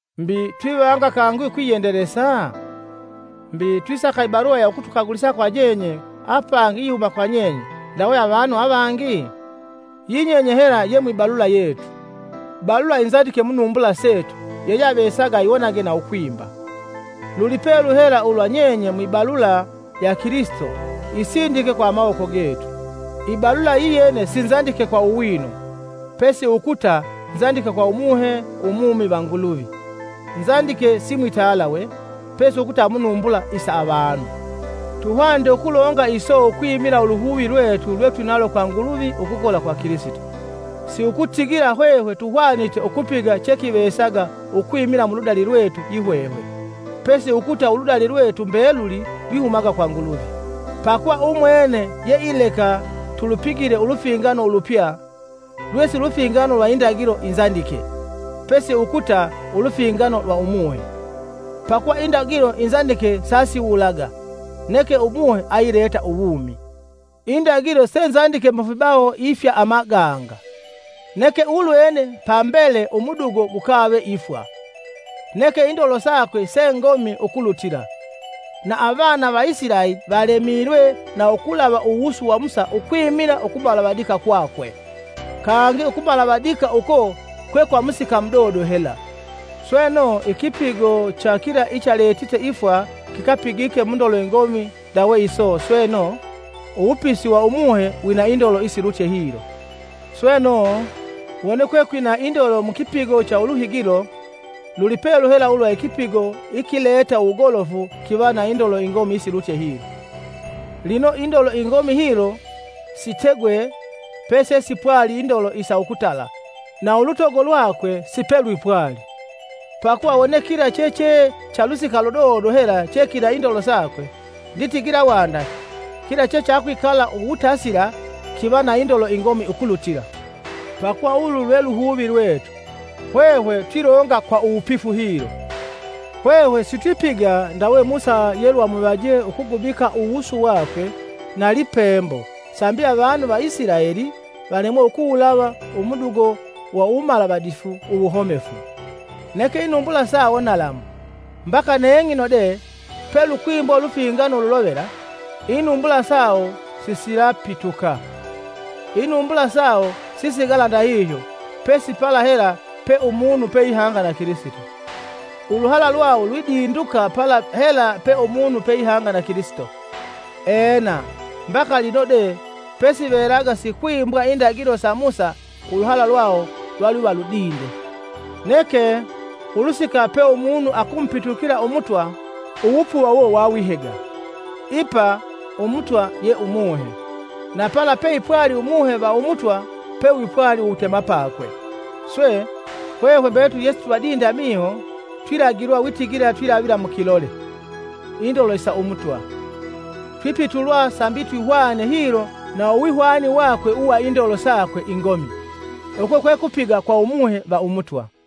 Mbi, twivanga kangi ukwiyendelesa? Mbi, twisaka i balula ya ukutukagulisa kwa nyenye, apangi iyihuma kwa nyenye, ndawe avanu avangi? Yi nyenye hela ye mwibalula yetu; balula inzandike munumbula setu yeyeavesaga ayiwonage na ukwimba. Lulipelu hela ulwa nyenye mwi balula ya Kilisito isindike kwa amawoko getu. Ibalula iyene sinzandike kwa uwino, pesi ukuta nzandike kwa Umuhe umumi va Nguluvi; nzandike si mwitalawe, pesi ukuta munumbula isa avanu. Tuhwanite ukulonga iso ukwimila uluhuvi lwetu lwetwinalo kwa Nguluvi ukukola kwa Kilisito. Si ukutigila hwehwe tuhwanite ukupiga chekivesaga ukwimila muludali lwetu yihwehwe, pesi ukuta uludali lwetu mbeluli lwihumaga kwa Nguluvi, pakuva umwene yeileka tulupigile ulufingano ulupya lwesi lufingano lwa indagilo inzandike, pesi ukuta ulufingano lwa Umuhe. Pakuva indagilo inzandike sasiwulaga, neke Umuhe ayileta uwumi. Indagilo senzandike mufibawo ifya amaganga. Neke ulwene pambele umudugo gukave ifwa, neke indolo sakwe sengomi ukulutila, na avana va Isilaeli valemilwe na ukulava uwusu wa Musa ukwimila ukumalavadika kwakwe. Kangi ukumalavadika uko kwe kwa musika mudodo hela, sweno ikipigo cha kila ichaletite ifwa kikapigike mundolo ingomi ndawe iso sweno, uwupisi wa Umuhe wina indolo isilutye hilo. Sweno, wone kwekwina indolo mu kipigo cha uluhigilo, lulipelu hela ulwa ikipigo ikileta uwogolofu kiva na indolo ingomi isilutye hilo. Lino indolo ingomi hilo sitegwe pesesipwali indolo isa ukutala, sa ulutogo lwakwe sipelwipwali. Pakuva wone kila cheche cha lusika ludodo hela chekina indolo sakwe, nditigila wanda kila chechakwikala uwutasila kiva na indolo ingomi ukulutila. Pakuva ulu lwe luhuvi lwetu, hwehwe twilonga kwa uwupifu hilo. Hwehwe sitwipiga ndawe Musa yelwamuvaje ukugubika uwusu wakwe na lipembo sambi avanu va Isilaeli valemwe ukuwulava umudogo wa uwumalavadifu uwuhomefu. Neke inumbula sawo nalamu; mbaka neng'ino de pelukwimbwa ulufingano ululovela, inumbula sawo sisilapituka. Inumbula sawo sisigala ndahihyo pesi pala hela pe umunu peihanga na Kilisito. Uluhala lwawo lwidinduka pala hela pe umunu peihanga na Kilisito. Ena, mbaka lino de pesivelaga sikwimbwa indagilo sa Musa uluhala lwawo lwalwiva ludinde. Neke, ulusika pe umunu akumupitukila Umutwa, uwupuva uwo wawihega. Ipa “Umutwa” ye Umuhe; na pala peipwali Umuhe va Umutwa pewipwali uwutemapakwe. Swe, hwehwe mbetuli yesitwivadinde amiho, twilagilwa witigila twilavila mu kilole, indolo isa Umutwa; twipitulwa sambi twihwane hilo na uwihwani wakwe uwa indolo sakwe ingomi. Uko kwekupiga kwa Umuhe va Umutwa.